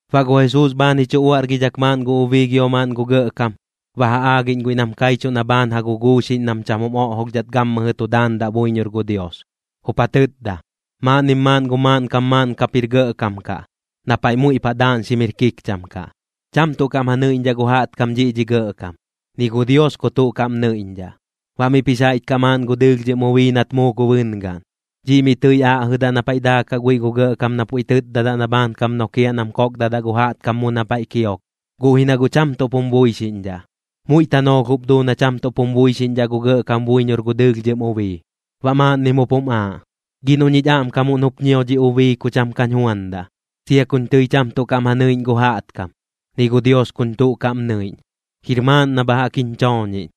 Baꞌ gu Jesuus bhaan ji chu uaꞌrgidhak maaꞌn gu ubii gio maaꞌn gu gɇꞌkam, ba ja aagiꞌñ guiꞌ nam kaichuꞌ na bhaan ja guguuxiꞌñ nam cham jim oꞌjolhdhat gammɨjɨ tu daandaꞌ buiñor gu Dios. Jup ja tɨtda: ―Maaꞌnnim maaꞌn gu maaꞌnkam maaꞌn kap jir gɇꞌkam kaꞌ, na paiꞌ muiꞌ paꞌ daaꞌñxim jir kikcham kaꞌ. Cham tuꞌ kaꞌm ja nɨiꞌñdhaꞌ gu jaꞌtkam dhiꞌ dhi gɇꞌkam, ni gu Dios ku tuꞌ kaꞌm nɨiꞌñdhaꞌ. Baꞌ miꞌp jix jaiꞌch kaꞌ maaꞌn gu dɨɨlhdhɨm ubii nat muu gu bɨngaꞌn. Dhiꞌ miꞌ tɨi aꞌjɨdaꞌ na paiꞌ daakaꞌ guiꞌ gu gɇꞌkam na pu tɨtdadaꞌ na bhaankam nokiaꞌ nam kokdadaꞌ gu jaꞌtkam mu na paiꞌ kio, guꞌ ji na guꞌ cham tuꞌp jum buixiꞌñdhaꞌ. Muiꞌ tanoolh jup duu na cham tuꞌp jum buixiꞌñdhaꞌ gu gɇꞌkam buiñor gu dɨɨlhdhɨm ubii. Baꞌ maaꞌnnim jup jum aaꞌ: “Gi noꞌ ñich aꞌmkamuꞌn jup ñio dhi ubii ku cham kañ juandaꞌ, sia kuñ tɨi cham tuꞌ kaꞌm ja nɨiꞌñ gu jaꞌtkam, ni gu Dios kuñ tuꞌ kaꞌm nɨiꞌñ. Jir maaꞌn na bha jaꞌk jiñ chooñiꞌñ.”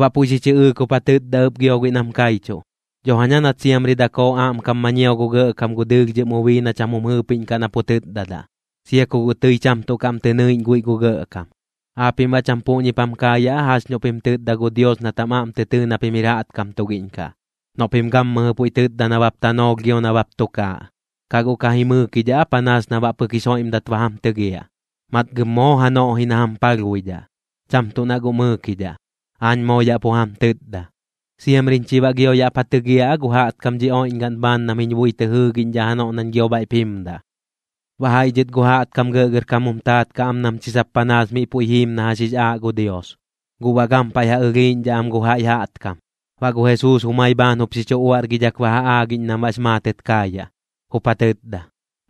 Baꞌ puiꞌ xi chɨꞌɨɨk jup ja tɨtda ɨp gio guiꞌ nam kaichuꞌ: ―Dho jaña nat siamri dakoo aꞌmkam ma ñio gu gɇꞌkam gu dɨɨlhdhɨm ubii na cham jum jɨɨpiꞌñkaꞌ na pu tɨtdadaꞌ, sia ku guꞌ tɨi cham tuꞌ kaꞌm tɨ nɨiꞌñ guiꞌ gu gɇꞌkam. ¿Aapiꞌm baꞌ cham puꞌñip jam kaayaꞌ aa jax noꞌ pim tɨtda gu Dios nat jam aꞌm tɨ tɨɨ na pim jir jaꞌtkam tugiꞌñ kaꞌ, noꞌ pim gammɨjɨ puiꞌ tɨtda nabap tanoolh gio nabap tukaaꞌ? ¿Kaꞌ guꞌ ka ji mɨɨkidhaꞌ aa panaas na baꞌ pɨk jix joiꞌmdat ba jam tɨgiaꞌ? Matgɨm moo janoꞌ ji na jam palhbuidhaꞌ, cham tuꞌ na guꞌ mɨɨkidhaꞌ, aañ moo yaꞌ pu jam tɨtda. ¿Siamriñ chi baꞌ gio yaꞌp ja tɨgiaꞌ aa gu jaꞌtkam dhi oiꞌñgaꞌn bhaan nam jiñ bui tɨ jɨɨgiꞌñdhaꞌ janoꞌ nañ gio bhaiꞌp jimdaꞌ? Baꞌ jaiꞌ dhɨt gu jaꞌtkam gɇꞌgɇrkam jum taat kaꞌ am nam chi sap panaas miꞌ puiꞌ jiim na jax jix aaꞌ gu Dios, guꞌ baꞌ gampaiꞌ ja ɨlhiiꞌñdhaꞌ am gu jaiꞌ jaꞌtkam. Baꞌ gu Jesuus jumai bhaan jup xi chu uaꞌrgidhak ba ja aagiꞌñ nam baꞌx maatɨt kaayaꞌ, jup ja tɨtda: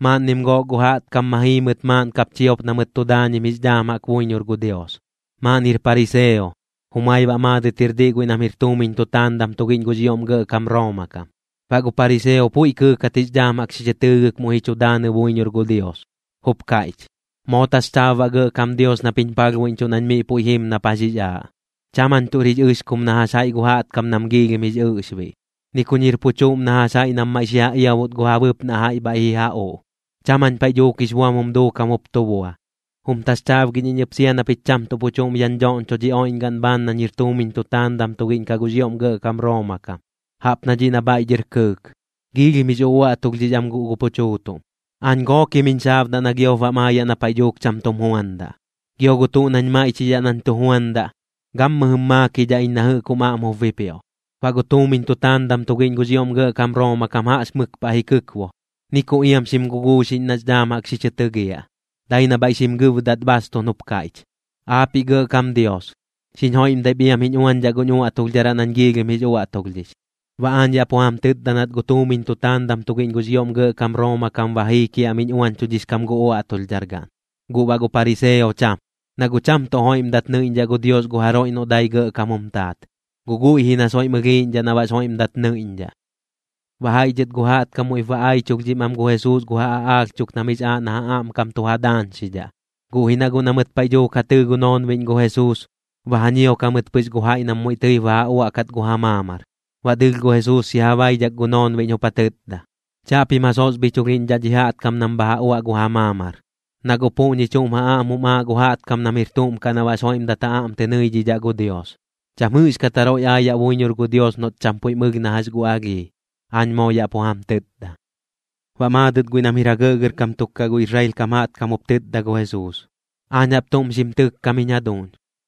―Maaꞌnnim gook gu jaꞌtkam ma jii mɨt maaꞌn kap chiop na mɨt tu daañim jix dhaam jaꞌk buiñor gu Dios. Maaꞌn jir pariseo, jumai baꞌ maadɨt jir diꞌ guiꞌ nam jir tuumiñ tutaandam tugiꞌñ gux ioꞌm gɇꞌkam Rooma kam. Baꞌ gu pariseo puiꞌ kɨɨkat jix dhaam jaꞌk xi chɨ tɨɨgɨk muiꞌ ji chu daanɨ buiñor gu Dios, jup kaiꞌch: “Moo taxchaab baꞌ Gɇꞌkam Dios nap jiñ palhbuiꞌñchuꞌ nañ miꞌ puiꞌ jim nap jax jix aaꞌ. Cham jañ tuꞌr jix ɨxkum na jax jaiꞌ gu jaꞌtkam nam giilhim jix ɨꞌxbiꞌ, ni kuñ jir pu chuꞌm na jax jaiꞌ nam maiꞌ xi ja iabut gu ja bɨpnaꞌ jaiꞌ bhaiꞌ ji ja uꞌ. Cham jañ paiꞌ dhuuk jix buam jum duukam jup tu bua. Jum taxchaabgiꞌñ iñ ɨp sia na pich cham tuꞌ pu chuꞌm yaꞌñ dhoꞌñcho dhi oiꞌñgaꞌn bhaan nañ jir tuumiñ tutaandam tugiꞌñ kaꞌ gux ioꞌm gɇꞌkam Rooma kam, jaꞌp na dhiꞌ na bhaiꞌ dhɨr kɨɨk. Giilhim jix uꞌuaꞌtulhdhix am guꞌ gu pu chuutuꞌm. Aañ gookim jiñ xaabdaꞌ na giop bam aayaꞌ na paiꞌ dhuuk cham tum juandaꞌ. Gio gu tuꞌ nañ maiꞌchidhaꞌ nañ tu juandaꞌ, gammɨjɨm maakidhaꞌ iñ na jɨꞌk jum aꞌm jup bipioꞌ.” Baꞌ gu tuumiñ tutaandam tugiꞌñ gux ioꞌm gɇꞌkam Rooma kam jaꞌx mɨk paꞌ ji kɨkbo, ni ku iam xim guguuxiꞌñ nax dhaam jaꞌk xi chɨ tɨgiaꞌ, dai na bhaiꞌ xim gɨbdat bhaastuꞌn jup kaiꞌch: “Aapiꞌ Gɇꞌkam Dios, xiñ joiꞌmdaip iam jiñ uañdhaꞌ guñ uaꞌtulhdharaꞌ nañ giilhim jix uaꞌtulhdhix.” Baꞌ aañ yaꞌ pu jam tɨtda nat gu tuumiñ tutaandam tugiꞌñ gux ioꞌm gɇꞌkam Rooma kam ba jii kiaꞌmiꞌñ uañchudhix kam gu uaꞌtulhdhar gaꞌn, guꞌ baꞌ gu pariseo cham. Na guꞌ cham tuꞌ joiꞌmdat nɨiꞌñdhaꞌ gu Dios gu jaroiꞌ noꞌ dai gɇꞌkam jum taat, guꞌ guiꞌ ji na soiꞌm ɨlhiiꞌñdhaꞌ na baꞌx joiꞌmdat nɨiꞌñdhaꞌ. Baꞌ jaiꞌ dhɨt gu jaꞌtkam muiꞌp ba aichulhdhim am gu Jesuus gu ja aꞌaalh chuk nam jix aaꞌ na ja aꞌmkam tu ja daañxidhaꞌ. Guꞌ ji na guꞌ na mɨt paiꞌ dhuuk ja tɨɨ gu noonbiꞌñ gu Jesuus, ba ja ñiok jamɨt pɨx gu jaiꞌ nam muiꞌ tɨip ba ja uaꞌkat gu ja maamar. Baꞌ dɨɨlh gu Jesuus xi ja baidhak gu noonbiꞌñ jup ja tɨtda: ―Chaꞌpim ja sosbhichulhiꞌñdhaꞌ dhi jaꞌtkam nam bha ja uaꞌ gu ja maamar, na guꞌ puꞌñi chuꞌm ja aꞌm jum aaꞌ gu jaꞌtkam nam jir tuꞌm kaꞌ na baꞌx joiꞌmdat ja aꞌm tɨ nɨidhidhaꞌ gu Dios. Cham jɨꞌxkat jaroiꞌ aayaꞌ buiñor gu Dios noꞌt cham puiꞌm ɨlh na jax gu alhii, aañ moo yaꞌ pu jam tɨtda. Baꞌ maadɨt guiꞌ nam jir ja gɇꞌgɇrkam tuk gu Israel kam jaꞌtkam jup tɨtda gu Jesuus: ―Aañ jaꞌp tuꞌm xim tɨkkam jiñ jaduuñ,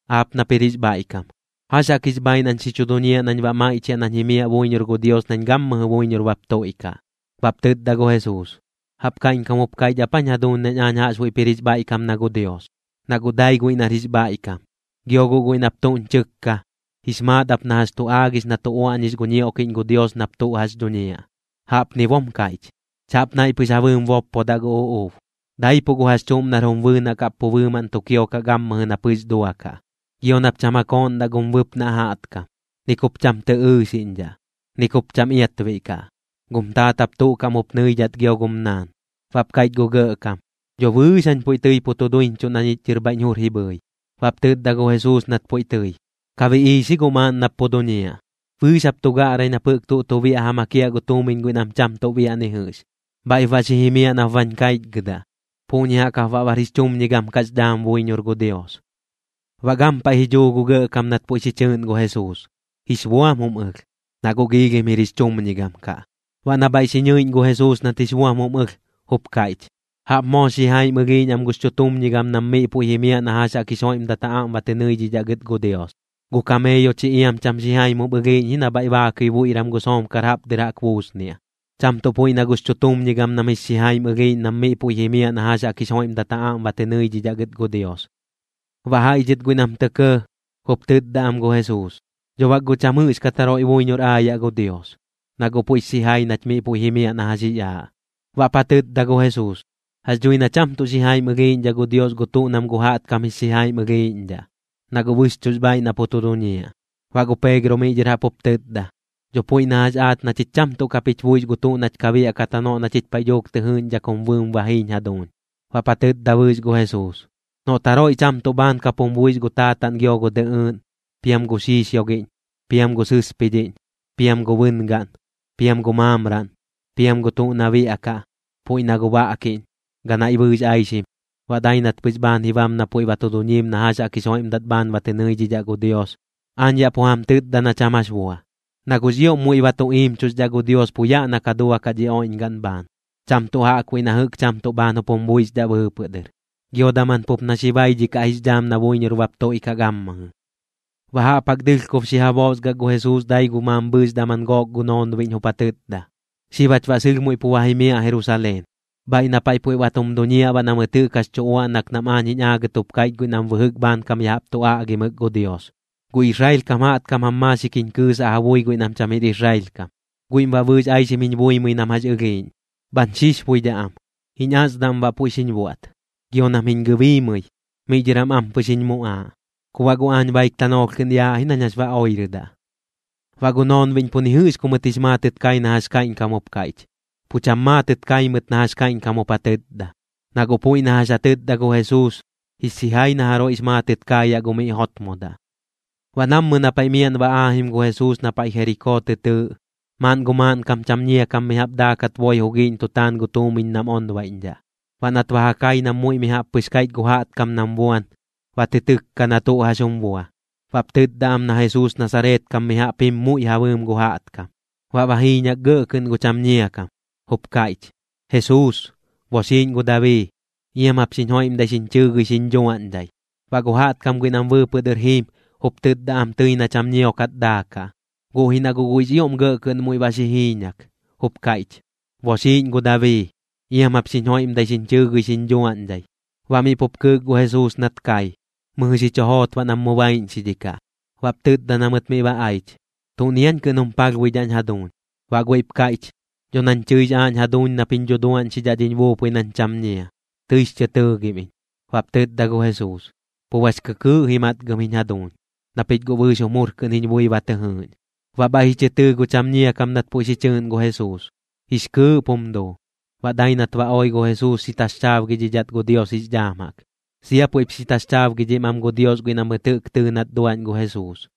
aap nap jir jix bhaiꞌkam. ¿Jax jaꞌk jix bhaaiꞌ nañ xi chu duñiaꞌ nañ baꞌ maiꞌchiaꞌ nañ jimiaꞌ buiñor gu Dios nañ gammɨjɨ buiñor bap tuiꞌkaꞌ? Baꞌp tɨtda gu Jesuus: ―¿Jaꞌp kaiꞌñkam jup kaiꞌch ap aañ jaduuñ nañ aañ jaꞌxbuiꞌp jir jix bhaiꞌkam na gu Dios? Na guꞌ dai guiꞌ nar jix bhaiꞌkam. Gio guꞌ guiꞌ nap tuꞌñ chɨkka, jix maat ap na jax tu aagix na tu uaꞌñix gu ñioꞌkiꞌñ gu Dios nap tuꞌ jax dhuñiaꞌ. Jaꞌpni bom kaiꞌch: “Chaꞌp naiꞌ pɨx ja bɨɨm boppodaꞌ gu uꞌuub, daipuꞌ gu jax chuꞌm nar jum bɨɨnaꞌ kaꞌp pu bɨɨmaꞌn tu kiokaꞌ gammɨjɨ nap jɨꞌx duakaꞌ. Gio nap cham ja kooꞌndaꞌ gum bɨpnaꞌ jaꞌtkam. Ni kup cham tɨ ɨɨxiꞌñdhaꞌ. Ni kup cham iatbiꞌ kaꞌ. Gum taat jap tuꞌ kaꞌm jup nɨiꞌñdhaꞌ gio gum naan.” Baꞌp kaiꞌch gu gɇꞌkam: ―Dho bɨɨx jañ puiꞌ tɨi pu tu duiñchuꞌ na ñich dhɨr bhaiꞌñ jur ji bhɨi. Baꞌp tɨtda gu Jesuus nat puiꞌ tɨi: ―Ka biꞌiix ji guꞌ maaꞌn nap pu duñiaꞌ. Bɨɨx jap tu gaꞌrai nap jɨꞌk tuꞌ tu biaꞌ ja makiaꞌ gu tuumiñ guiꞌ nam cham tuꞌ biaꞌ ni jɨꞌx, bhaiꞌp baꞌ xi jimiaꞌ nap bañ kaichgɨdaꞌ. Puꞌñi jaꞌk jap baꞌ bar jix chumñigam kaꞌx dhaam buiñor gu Dios. Baꞌ gampaiꞌ ji dhuu gu gɇꞌkam nat puiꞌ xi chɨɨꞌn gu Jesuus, jix buam jum ɨlh, na guꞌ giilhim jir jix chumñigam kaꞌ. Baꞌ na bhaiꞌ xi ñɨiꞌñ gu Jesuus nat jix buam jum ɨlh, jup kaiꞌch: ―¡Jaꞌp moox xijaim ɨlhiiꞌñ am gux chutumñigam nam miꞌ puiꞌ jimiaꞌ na jax jaꞌk jix joiꞌmdat ja aꞌm ba tɨ nɨidhidhaꞌ gɨt gu Dios! Gu kameeyo chi iam cham xijaim jup ɨlhiiꞌñ ji na bhaiꞌ baakɨi buiꞌram gu soomkar jaꞌp dɨr jaꞌk buusniaꞌ, cham tuꞌ puiꞌ na gux chutumñigam nam jix xijaim ɨlhiiꞌñ nam miꞌ puiꞌ jimiaꞌ na jax jaꞌk jix joiꞌmdat ja aꞌm ba tɨ nɨidhidhaꞌ gɨt gu Dios. Baꞌ jaiꞌ dhɨt guiꞌ nam tɇ kɇɇ, jup tɨtda am gu Jesuus: ―¡Dho bak guꞌ cham jɨꞌxkat jaroiꞌ buiñor aayaꞌ gu Dios, na guꞌ puiꞌx xijai nach miꞌ puiꞌ jimiaꞌ na jax jix aaꞌ! Baꞌp ja tɨtda gu Jesuus: ―Jax dhui na cham tuꞌ xijaim ɨlhiiꞌñdhaꞌ gu Dios gu tuꞌ nam gu jaꞌtkam jix xijaim ɨlhiiꞌñdhaꞌ, na guꞌ bɨxchuꞌx bhaaiꞌ na pu tu duñiaꞌ. Baꞌ gu Peegro miꞌ dhɨr jaꞌp jup tɨtda: ―Dho puiꞌ na jax aach na chich cham tuꞌ kap jich buix gu tuꞌ nach ka biaꞌkat janoꞌ na chich paiꞌ dhuuk tɨ jɨɨꞌñdhak jum bɨɨm ba jiiñ jaduuñ. Baꞌp ja tɨtda bɨɨx gu Jesuus: ―Noꞌt jaroiꞌ cham tuꞌ bhaan kap jum buix gu taataꞌn gio gu dɨꞌɨɨꞌn, piam gu xiixiogiꞌñ, piam gu sɨspidhiꞌñ, piam gu bɨngaꞌn, piam gu maamraꞌn, piam gu tuꞌ na biaꞌkaꞌ, puiꞌ na gu baꞌkiꞌñ, ganaiꞌ bɨɨx aixim, baꞌ dai nat pɨx bhaan ji bam na puiꞌ ba tu duñiim na jax jaꞌk jix joiꞌmdat bhaan ba tɨ nɨidhidhaꞌ gu Dios, aañ yaꞌ pu jam tɨtda na cham jax bua. Na guꞌx ioꞌm muiꞌ ba tu iimchuxdhaꞌ gu Dios pu yaꞌ na ka duakaꞌ dhi oiꞌñgaꞌn bhaan, cham tuꞌ jaꞌkbuiꞌ na jɨꞌk cham tuꞌ bhaan jup jum buixdhaꞌ bɨɨpɨꞌ dɨr. Gio daman pup na xi baidhikaꞌ jix dhaam na buiñor bap tuiꞌkaꞌ gammɨjɨ. Baꞌ jaꞌp jaꞌk dɨlhkob xi ja boosgak gu Jesuus dai gu mambhɨɨx daman gook gu noonbiꞌñ jup ja tɨtda: ―Xib jach baꞌ sɨlh muiꞌ pu ba jimiaꞌ Jerusaleen, bhaiꞌ na paiꞌ puiꞌ ba tum duñiaꞌ baꞌ na mɨt jɨꞌk jax tu uaꞌnak nam aañ jiñ aagɨt jup kaiꞌch guiꞌ nam bɨjɨk bhaankam ya jaꞌp tu aꞌgimɨk gu Dios. Gu Israel kam jaꞌtkam jam maaxik jiñ kɨɨsaꞌ ja bui guiꞌ nam cham jir Israel kam, guiꞌm baꞌ bɨɨx aixim jiñ buimɨi nam jax ɨlhiiꞌñ, bhañ xixbuidhaꞌ am, jiñ asdam baꞌ puiꞌ xiñ buaꞌt. Gio nam jiñ gɨbiimɨi, miꞌ dhɨr jam ampɨx jiñ muꞌaaꞌ. Ku baꞌ guꞌ aañ baik tanoolh kɨꞌn yaaꞌ ji nañ jax ba oirɨdaꞌ. Baꞌ gu noonbiꞌñ pu ni jɨꞌx ku mɨt jix maatɨt kai na jax kaiꞌñkam jup kaiꞌch, pu cham maatɨt kai mɨt na jax kaiꞌñkam jup ja tɨtda. Na guꞌ puiꞌ na jax ja tɨtda gu Jesuus, jix xijai na jaroiꞌx maatɨt kaayaꞌ gu miꞌ jotmodaꞌ. Baꞌ nammɨ na miaꞌn ba aajim gu Jesuus na paiꞌ Jerikoo tɨ tɨɨꞌ, maaꞌn gu maaꞌnkam cham ñia kam mi jaꞌp daakat boi jugiiꞌñ tu taan gu tuumiñ nam onbaiꞌñdhaꞌ. Baꞌ nat ba ja kai nam muiꞌ mi jaꞌp pɨx kaiꞌch gu jaꞌtkam nam buan, ba tɨ tɨkka na tuꞌ jax jum bua. Baꞌp tɨtda am na Jesuus Nasareet kam mi jaꞌp jim muiꞌ ja bɨɨm gu jaꞌtkam. Baꞌ ba jiiñak gɇꞌ kɨꞌn gu cham ñia kam, jup kaiꞌch: ―¡Jesuus, boxiiꞌñ gu Dabii! ¡Iam jap xiñ joiꞌmdai xiñ chɨɨgɨi xiñ dhuaꞌñdhai! Baꞌ gu jaꞌtkam guiꞌ nam bɨɨpɨꞌ dɨr jiim, jup tɨtda am tɨi na cham ñiokat daakaꞌ, guꞌ ji na guꞌ guiꞌx ioꞌm gɇꞌ kɨꞌn muiꞌ ba xi jiiñak, jup kaiꞌch: ―¡Boxiiꞌñ gu Dabii! ¡Iam jap xiñ joiꞌmdai xiñ chɨɨgɨi xiñ dhuaꞌñdhai! Baꞌ miꞌ pup kɨɨk gu Jesuus nat kai, mɨjɨ xi chu joot baꞌ nam mu baiꞌñxidhikaꞌ. Baꞌp tɨtda na mɨt miꞌ ba aich: ―¿Tuꞌni aañ kɨꞌn jum palhbuidhaꞌñ jaduuñ? Baꞌ guiꞌp kaiꞌch: ―Dho nañ tɨix aaꞌñ jaduuñ nap jiñ dhuduaꞌñxidhaꞌ dhiñ buupui nañ cham ñia. Tɨix chɨ tɨɨgim iñ. Baꞌp tɨtda gu Jesuus: ―Pu bax kɨkɨɨꞌ ji matgɨm jiñ jaduuñ, na pich guꞌ bɨɨx jum jur kɨꞌn jiñ bui ba tɨ jɨɨꞌñ. Baꞌ bhaiꞌ ji chɨ tɨɨ gu cham ñia kam nat puiꞌ xi chɨɨꞌn gu Jesuus, jix kɨɨꞌp jum duu. Baꞌ dai nat ba oi gu Jesuus xi taxchaabgidhidhat gu Dios jix dhaam jaꞌk. Sia puiꞌp xi taxchaabgidhim am gu Dios guiꞌ na mɨt jɨꞌk tɨɨ nat duaꞌñ gu Jesuus.